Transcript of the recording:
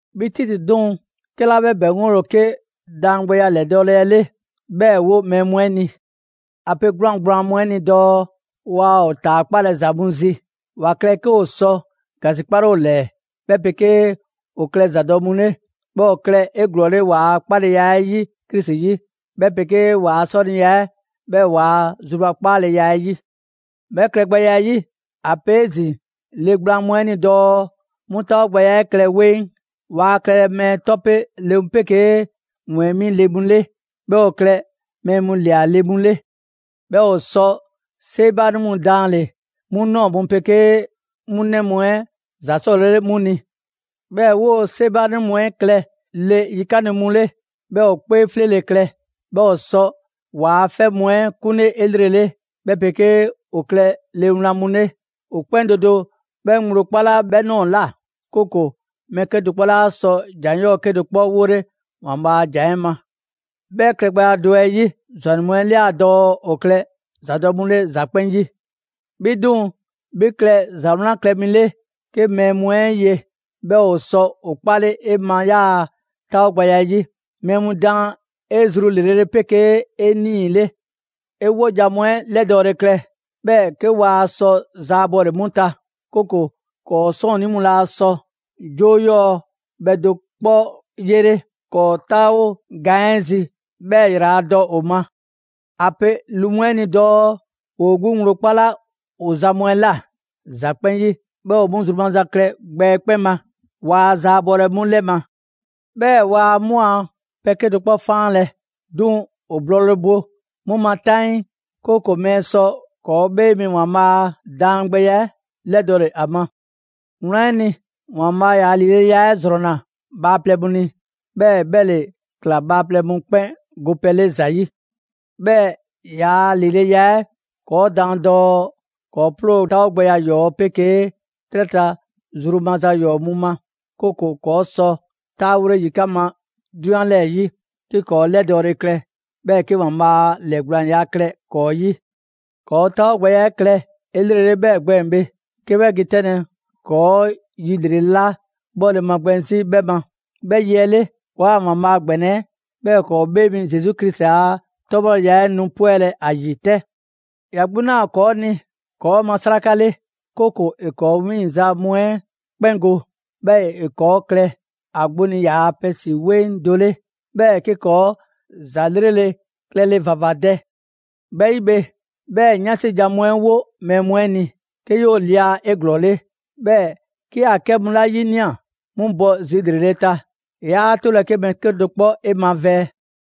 'Bhi Titi 'duŋ‑, 'kɛla 'bhɛ ‑bɛŋgole ‑o 'ke daangbɛya 'lɛdɔɔle 'ɛ 'le, 'bhɛɛ‑ 'wo mɛɛ mu 'ɛ ni. ‑A pe 'gwlaan‑ gblaan mu 'ɛ ni dɔɔ waa ‑o ‑taakpalɛ ‑za mu zi. ‑Wa klɛ 'ke ‑o sɔ ‑gasikpale ‑o ‑lɛɛ, 'bhɛ 'pegee ‑o klɛ ‑zadɔ' mu 'le. 'Bhɛɛ‑ ‑o klɛ 'eglɔɔle ‑waa' 'kpaleya 'ɛ 'yi Krisi 'yi, 'bhɛ 'pegee ‑waa' 'sɔniya 'ɛ, 'bhɛɛ‑ waa zrubakpaaleya 'ɛ 'yi. 'Bhɛ klɛgbɛya 'ɛ 'yi, ‑a pe 'ezin‑ le gblaan mu 'ɛ ni dɔɔ 'mu 'taawogbɛya 'ɛ klɛ 'weŋ. Waa klɛlɛ mɛɛ 'tɔpe le mu 'pegee ‑wɛɛnmi' le mu 'le. 'Bhɛɛ‑ ‑o klɛ mɛɛ mu ‑lia le mu 'le. 'Bhɛɛ‑ ‑o 'sɔ 'seebaanɛ mu daanle‑ 'mu ꞊nɔɔ mu 'pegee 'mu 'nɛ mu 'ɛ ‑za 'sɔlele 'mu ni. 'Bhɛɛ‑ 'woo‑ 'seebaanɛ mu 'ɛ klɛ le yikanle mu 'le, 'bhɛɛ‑ ‑o 'kpee 'fleele‑ klɛ. 'Bhɛɛ‑ ‑o 'sɔ ‑waa' 'fɛ mu 'ɛ 'kunle 'elrele, 'bhɛ 'pegee ‑o klɛ le wlan mu 'le. ‑O 'kpɛn do do 'bhɛ ŋgblo 'kpala 'bhɛ ꞊nɔɔ ꞊la, 'kooko‑ mɛɛ 'kedo‑ 'kpɔ 'laa sɔ ‑jan 'yɔɔ‑ 'kedo‑ 'kpɔ 'wole ‑Waanbhaa' a ‑jan 'ɛ ma. 'Bhɛ klɛgbɛya do 'ɛ 'yi, ‑zwannɛ mu 'ɛ ꞊lia dɔɔ ‑o klɛ ‑zadɔ' mu 'le ‑za 'kpɛn 'yi. 'Bhi 'duŋ‑, 'bhi klɛ ‑za 'wlan klɛ mi 'le 'ke mɛɛ mu 'e ye, 'bhɛɛ‑ ‑o sɔ ‑o kpale 'e ma 'yaa‑ 'taawogbɛya 'ɛ 'yi. Mɛɛ mu daan 'e zru ‑lrele' 'le 'pegee 'e 'nii‑ 'le. 'E 'wojan‑ mu 'ɛ 'lɛdɔɔle klɛ, 'bhɛɛ‑ 'ke waa sɔ zaabɔle 'mu ta, 'kooko‑ ‑kɔɔ' 'sɔɔnnii mu laa sɔ 'joo 'yɔɔ‑ bhɛ 'kedo‑ 'kpɔ 'yele ‑kɔɔ' 'taawo gaan 'ɛ zi, 'bhɛɛ‑ ‑yraladɔ ‑o ma. ‑A pe lu mu 'ɛ ni dɔɔ ‑woo 'gbu ŋgblo 'kpala ‑o zan mu 'ɛ ꞊la ‑za 'kpɛn 'yi, 'bhɛɛ‑ ‑o 'mu zru maza mu klɛ gbɛ 'ɛ 'kpɛn ma. Waa zaabɔlɛ 'mu 'lɛ ma. 'Bhɛɛ‑ waa 'mu a pɛ 'kedo‑ 'kpɔ 'faanlɛ‑. 'Duŋ‑ ‑o blɔɔle bo 'mu ma 'taŋii, 'kooko‑ mɛɛ mu sɔ ‑kɔɔ' 'Bhee Mi ‑Waanbhaa' a daangbɛya 'ɛ 'lɛdɔle ‑a ma. Wlan 'ɛ ni, ‑Waanbhaa' ‑yaa' ‑lileya 'ɛ ‑zrɔnna bhaaplɛŋ mu ni, 'bhɛɛ‑ 'bhɛ ‑le ‑kla bhaaplɛŋ mu 'kpɛn gopɛ 'le ‑za 'yi. 'Bhɛɛ‑ ‑yaa' ‑lileya 'ɛ ‑kɔɔ' daan dɔɔ ‑kɔɔ' 'ploo‑ 'taawogbɛya ‑yɔɔ' 'pegee 'trɛ ta zru maza ‑yɔɔ' mu ma, 'kooko‑ ‑kɔɔ' sɔ 'taawole yikan' ma 'drunyan 'lɛɛ‑ 'yi, 'ke ‑kɔɔ' 'lɛdɔɔle klɛ, 'bhɛɛ‑ 'ke ‑Waanbhaa' ‑lɛɛgblaanya klɛ ‑kɔɔ' 'yi. ‑Kɔɔ' 'taawogbɛya 'ɛ klɛ 'elrele 'bhɛɛ‑ gbɛɛn‑ bhe, 'ke 'bhɛ ge 'tɛnlɛ‑ ‑kɔɔ' yi ‑lrele' 'la 'bhɔle‑ magbɛn 'zi 'bhɛ ma. 'Bhɛ yi 'ɛ 'le, ‑kɔɔa' ‑Waanbhaa' ‑gbɛnɛ 'ɛ, 'bhɛɛ‑ ‑kɔɔ' 'Bhee Mi Zesu Krisi a 'tɔbhɔleya 'ɛ nu 'pwɛlɛ‑ ‑a ‑yi 'tɛ. ‑Ya 'gbu 'naa‑ ‑kɔɔ' ni ‑kɔɔ' ma 'sraka 'le; 'kooko‑ ‑e ‑kɔɔ' 'wiiŋ‑ ‑za 'yɔɔ‑ mu 'ɛ 'kpɛn go, 'bhɛɛ‑ ‑e ‑kɔɔ' klɛ ‑a 'gbu ni ‑yaa' pɛ 'si 'weŋ do 'le, 'bhɛɛ‑ 'ke ‑kɔɔ' ‑za 'lrele‑ klɛle ‑vavadɛ. 'Bhɛ 'yi bhe, 'bhɛɛ‑ 'yansi jan mu 'ɛ 'wo mɛɛ mu 'ɛ ni, 'ke 'yoo‑ lia 'eglɔɔle. 'Bhɛɛ‑ 'ke ‑a 'kɛ mu 'la 'yinia‑, 'mu bɔ zi ‑lrele' ta. 'Yaa 'tolɛ‑ 'ke mɛɛ 'kedo‑ 'kpɔ 'e mavɛɛ.